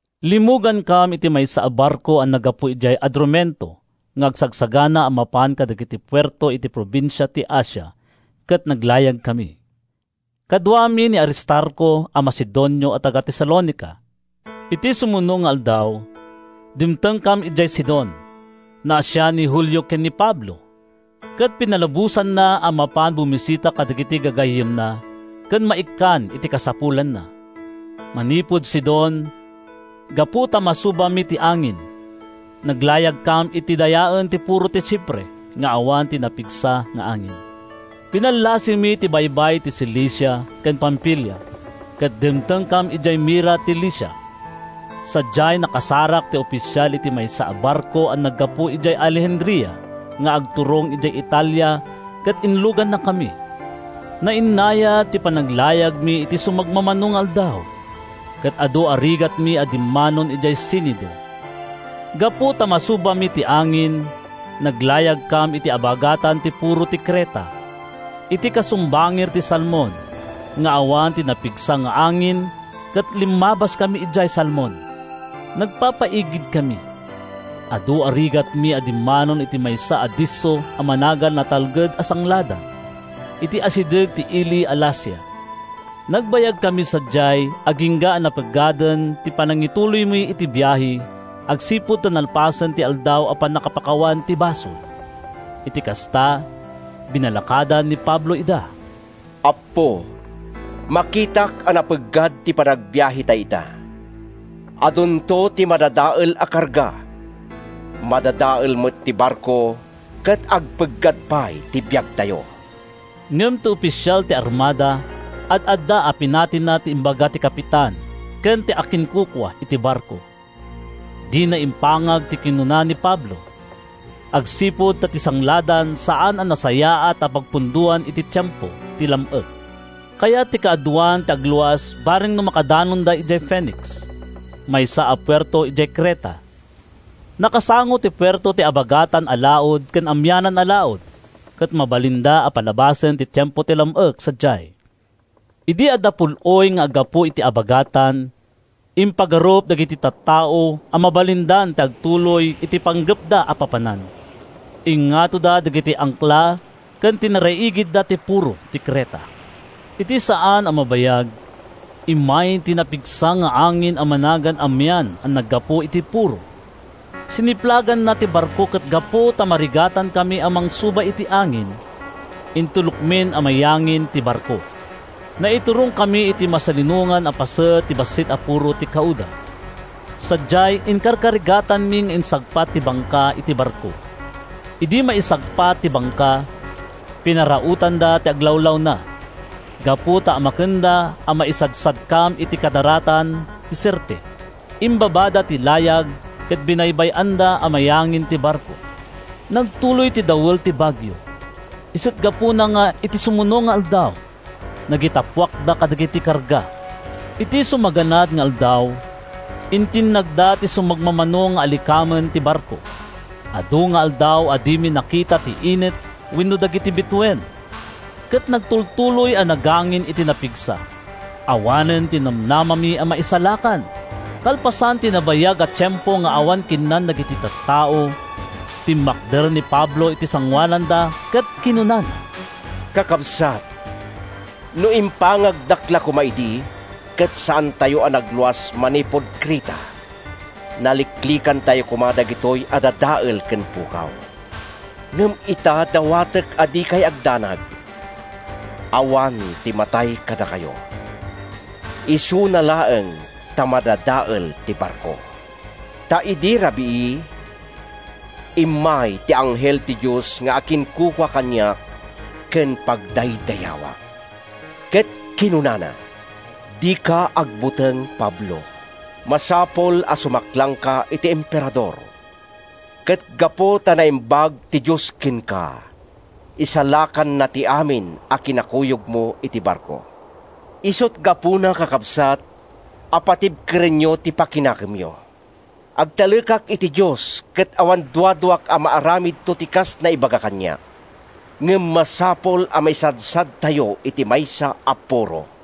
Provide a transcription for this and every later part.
Limmugankam iti maysa a barko a naggapu idiay Adrumeto nga agsagsagana a mapan kadagiti puerto iti probinsia ti Asia ket naglayagkami. Kaduami ni Aristarco a Macedonio a taga-Tesalonica. Iti sumuno nga aldaw, dimtengkam idiay Sidon. Naasian ni Julio ken ni Pablo, ket pinalubosanna a mapan bumisita kadagiti gagayyemna ken maikkan iti kasapulanna. Manipud Sidon, gapu ta masubami ti angin, naglayagkam iti dayaen ti puro ti Chipre nga awan ti napigsa nga angin. Binallasiwmi ti baybay ti Cilicia ken Pamfilia ket dimtengkam idiay Mira ti Licia. Sadiay, nakasarak ti ofisial iti maysa a barko a naggapu idiay Alejandria nga agturong idiay Italia ket inlugannakami. Nainnayad ti panaglayagmi iti sumagmamano nga aldaw, ket adu a rigatmi a dimmanon idiay Cinido. Gapu ta masubami ti angin, naglayagkam iti abagatan ti puro ti Creta, iti kasumbangir ti Salmon, nga awan ti napigsa nga angin ket limmabaskami idiay Salmon. Nagpapaigidkami. Adu a rigatmi a dimmanon iti maysa a disso a managan Natalged a Sangladan, iti asideg ti ili a Lasea. Nagbayagkami sadiay agingga a napeggaden ti panangituloymi iti biahe agsipud ta nalpasen ti Aldaw a Pannakapakawan ti Basol. Iti kasta, binalakadan ni Pablo ida: “Appo, makitak a napeggad ti panagbiahetay ita. Adunto ti madadael a karga. Madadael met ti barko, ket agpeggad pay ti biagtayo.” Ngem ti ofisial ti armada ad-adda a pinatina ti imbaga ti kapitan ken ti akinkukua iti barko. Dina impangag ti kinuna ni Pablo. Agsipud ta ti sangladan saan a nasayaat a pagpundoan iti tiempo ti lam-ek, kayat ti kaaduan ti agluas bareng no makadanonda idiay Fenix, maysa a puerto idiay Creta. Nakasango ti puerto iti abagatan-a-laud ken amianan-a-laud ket mabalinda a palabasen ti tiempo ti lam-ek sadiay. Idi adda pul-oy nga aggapu iti abagatan, impagarup dagiti tattao a mabalindan ti agtuloy iti panggepda a papanan. Ingngatoda dagiti angkla ket tinaraigidda ti puro ti Creta. Iti saan a mabayag, immay ti napigsa nga angin a managan Amian a naggapu iti puro. Siniplaganna ti barko ket gapu ta marigatankami a mangsuba iti angin, intulokmin a mayangin ti barko. Naiturongkami iti masalinongan a paset ti bassit a puro ti Cauda. Sadiay, inkarkarigatanmi nga insagpat ti bangka iti barko. Idi maisagpatda ti bangka, pinarautanda ti aglawlawna. Gapu ta amakenda a maisadsadkam iti kadaratan ti Sirte, imbabada ti layag ket binaybay-andan a mayangin ti barko. Nagtuloy ti dawel ti bagio, isut’ gapuna nga iti sumuno nga aldaw, nagitappuakda kadagiti karga. Iti sumaganad nga aldaw, intinnagda ti sumagmamano nga alikamen ti barko. Adu nga aldaw a dimi nakita ti init wenno dagiti bituen, ket nagtultuloy a nagangin iti napigsa. Awanen ti namnamami a maisalakan. Kalpasan ti nabayag a tiempo nga awan kinnan dagiti tattao, timmakder ni Pablo iti sangoananda ket kinunana: “Kakabsat, no impangagdak la koma idi, ket saantayo a nagluas manipud Creta, naliklikantayo koma dagitoy a dadael ken pukaw. Ngem ita, dawatek a dikay agdanag. Awan ti matay kadakayo. Isuna laeng ta madadael ti barko. Ta idi rabii, immay ti anghel ti Dios nga akinkukua kaniak ken pagdaydayawak, ket kinunana, ‘Dika agbuteng, Pablo! Masapul a sumaklangka iti Emperador. Ket gapu ta naimbag ti Dios kenka, isalakanna ti amin a kinakuyogmo iti barko.’ Isut’ gapuna, kakabsat, a patibkerenyo ti pakinakemyo! Agtalekak iti Dios ket awan duaduak a maaramidto ti kas naibaga kaniak. Ngem masapul a maisadsadtayo iti maysa a puro.”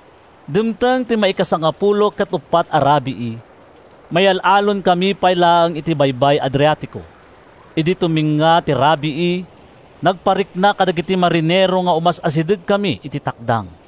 Dimteng ti maika-14 a rabii. Mayal-allonkami pay laeng iti Baybay Adriatico. Idi tumengnga ti rabii, nagparikna kadagiti marinero nga umas-asidegkami iti takdang.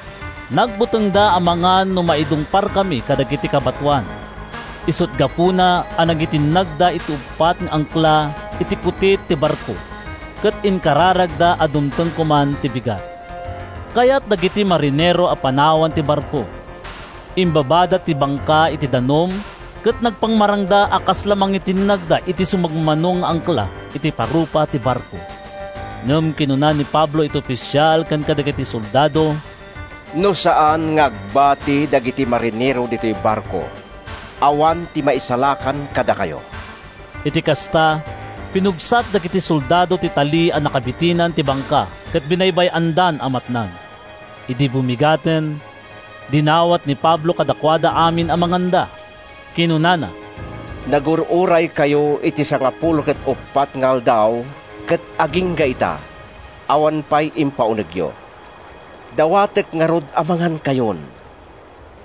Nagbutengda amangan no maidungparkami kadagiti kabatoan, isut’ gapuna a nangitinnagda iti uppat nga angkla iti kutit ti barko ket inkararagda a dumteng koman ti bigat. Kayat dagiti marinero a panawan ti barko. Imbabada ti bangka iti danum ket nagpamarangda a kasla mangitinnagda iti sumagmamano nga angkla iti parupa ti barko. Ngem kinuna ni Pablo iti ofisial ken kadagiti soldado, “No saan nga agbati dagiti marinero ditoy barko, awan ti maisalakan kadakayo.” Iti kasta, pinugsat dagiti soldado ti tali a nakaibitinan ti bangka ket binaybay-andan a matnag. Idi bumigaten, dinawat ni Pablo kadakuada amin a manganda. Kinunana: “Nagur-uraykayo iti sangapulo ket uppat nga aldaw, ket agingga ita awan pay impaunegyo. Dawatek ngarud a mangankayon.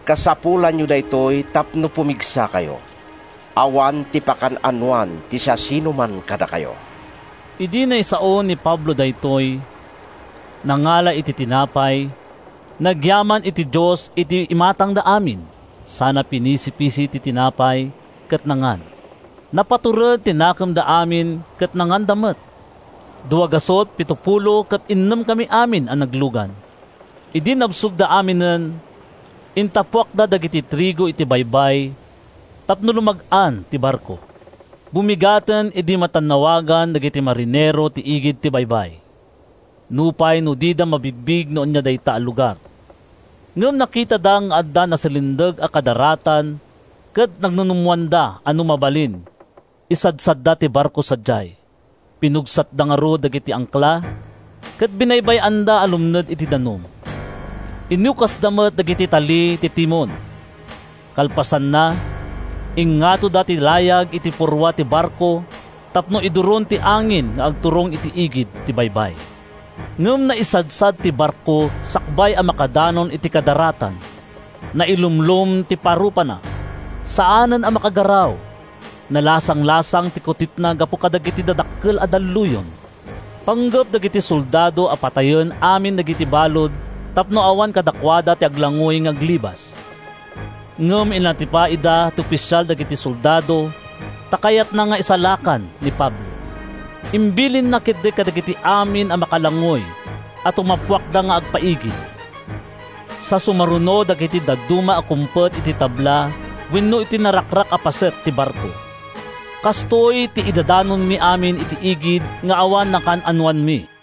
Kasapulanyo daytoy tapno pumigsakayo. Awan ti pakaan-anoan ti siasinoman kadakayo.” Idi naisaon ni Pablo daytoy, nangala iti tinapay, nagyaman iti Dios iti imatangda amin sana pinisipisi ti tinapay ket nangan. Napatured ti nakemda amin ket nanganda met. Duagasut, pitopulo ket innemkami amin a naglugan. Idi nabsogda aminen, intappuakda dagiti trigo iti baybay tapno lumag-an ti barko. Bumigaten idi matannawagan dagiti marinero ti igid ti baybay, nupay no dida mabigbig no ania dayta a lugar. Ngem nakitada nga adda nasalindeg a kadaratan ket nagnunummoanda a no mabalin, isadsadda ti barko sadiay. Pinugsatda ngarud dagiti angkla, ket binay-anda a lumned iti danum. Inukasda met dagiti tali ti timon. Kalpasanna, ingngatoda ti layag iti purwa ti barko tapno iduron ti angin nga agturong iti igid ti baybay. Ngem naisadsad ti barko sakbay a makadanon iti kadaratan. Nailumlom ti parupana. Saanen a makagaraw. Nalasanglasang ti kutitna gapu kadagiti dadakkel a dalluyon. Panggep dagiti soldado a patayen amin dagiti balud tapno awan kadakuada ti aglangoy nga aglibas. Ngem inatipa ida ti ofisial dagiti soldado ta kayatna nga isalakan ni Pablo. Imbilinna ketdi kadagiti amin a makalangoy a tumappuakda nga agpaigid, sa sumaruno dagiti dadduma a kumpet iti tabla wenno iti narakrak a paset ti barko. Kastoy ti idadanonmi amin iti igid nga awan nakaan-anoanmi.